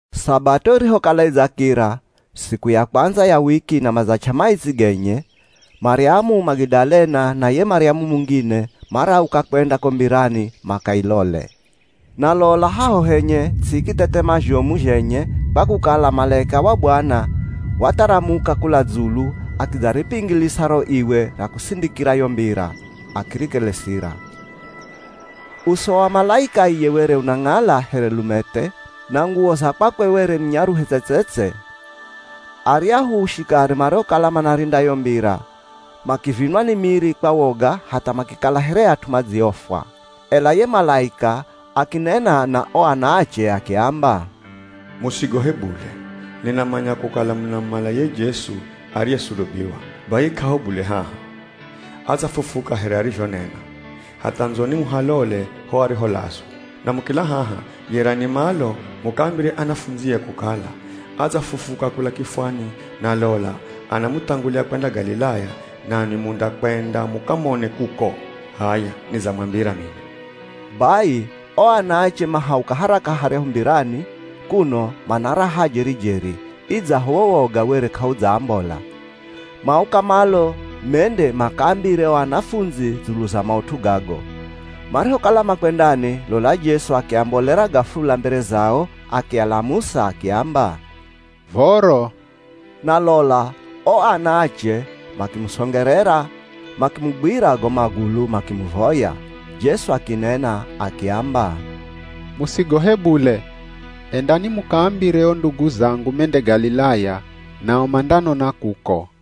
Sabato irihokala idzakira, siku ya kwandza ya wiki na madzach'a maitsi genye, Maryamu Magidalena, na ye Maryamu mungine, marauka kwenda ko mbirani makailole. Na lola haho henye ts'i ikithethema zhomu zhenye kwa kukala malaika wa Bwana watharamuka kula dzulu akidzaripingilisa ro iwe ra kusindikira yo mbira, akirikelesira. Uso wa malaika iye were unang'ala here lumethe, na nguwo za kwakwe were ni nyaruhe tse-tse-tse. Aryahu shikari mariokala manarinda yo mbira makivinwa ni miri kwa woga hatha makikala here at'u madziofwa. Ela ye malaika akinena na o anaache akiamba, “Musigohe bule. Ninamanya kukala munamumala ye Jesu ariyesulubiwa, bai k'aho bule haha. Adzafufuka here arizhonena. Hatha ndzoni muhalole ho ariholazwa. Na mukila haha, yerani malo mukaambire anafundzie kukala, ‘Adzafufuka kula kifwani na lola anamuthangulia kwenda Galilaya nanwi mundakwenda mukamone kuko.’ H'aya nidzamwambira mino.” Bai o anaache mahauka haraka haryahu mbirani, kuno mana raha jeri-jeri, idzaho wo woga were k'audzaambola. Mauka malo mende makaambire o anafundzi dzulu za maut'u gago. Marihokala makwendani, lola Jesu akiambolera gafula mbere zao, akialamusa akiamba, “Voro.” Na lola o anaache makimusongerera makimugwira go magulu makimuvoya. Jesu akinena akiamba, “Musigohe bule. Endani mukaambire o ndugu zangu mende Galilaya, nao mandanona kuko.”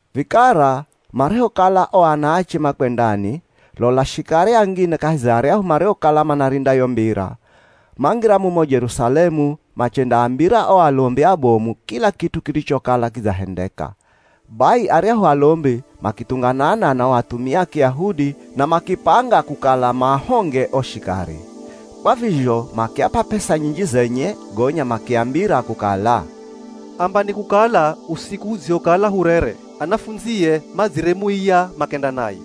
Vikara marihokala o anaache makwendani, lola shikari angine kahi za aryahu mariokala manarinda yo mbira, mangira mumo Jerusalemu machendaambira o alombi abomu kila kit'u kirichokala kidzahendeka. Bai aryahu alombi makithunganana na o athumia a Kiyahudi na makipanga kukala maahonge o shikari. Kwa vizho makiap'a p'esa nyinji zenye, gonya makiambira kukala, “Ambani kukala usiku hudzihokala hurere, anafundzie madziremuiya makenda naye.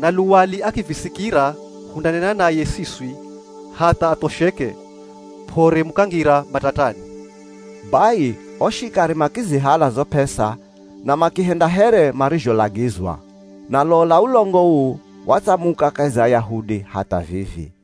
Na luwali akivisikira hundanena naye siswi hatha athosheke p'ore mukangira matatani.” Bai o shikari makizihala zo p'esa na makihenda here marizholagizwa. Na lola ulongo uu watsamuka kahi za Ayahudi hatha vivi.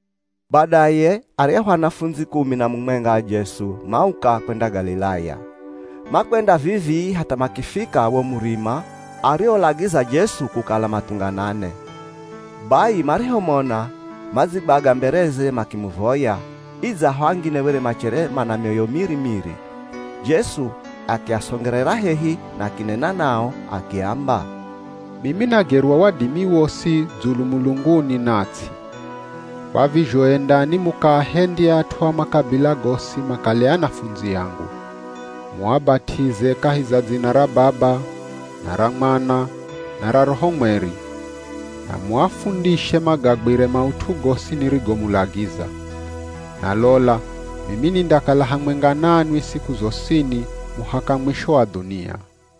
Badaye aryahu anafundzi kumi na mumwenga a Jesu mauka kwenda Galilaya. Makwenda vivii hatha makifika wo murima ariolagiza Jesu kukala mathunganane. Bai marihomona, madzigwaga mbereze makimuvoya, idzaho angine were machere mana mioyo miri-miri. Jesu akiasongerera hehi na akinena nao akiamba, “Mimi nagerwa wadimi wosi dzulu mulunguni na ts'i. Kwa vizho endani mukaahendye at'u a makabila gosi makale anafundzi angu. Muabat'ize kahi za dzina ra Baba, na ra Mwana, na ra Roho Mweri. Na muafundishe magagwire maut'u gosi nirigomulagiza. Na lola mimi nindakala hamwenga nanwi siku zosini muhaka mwisho wa dhunia.”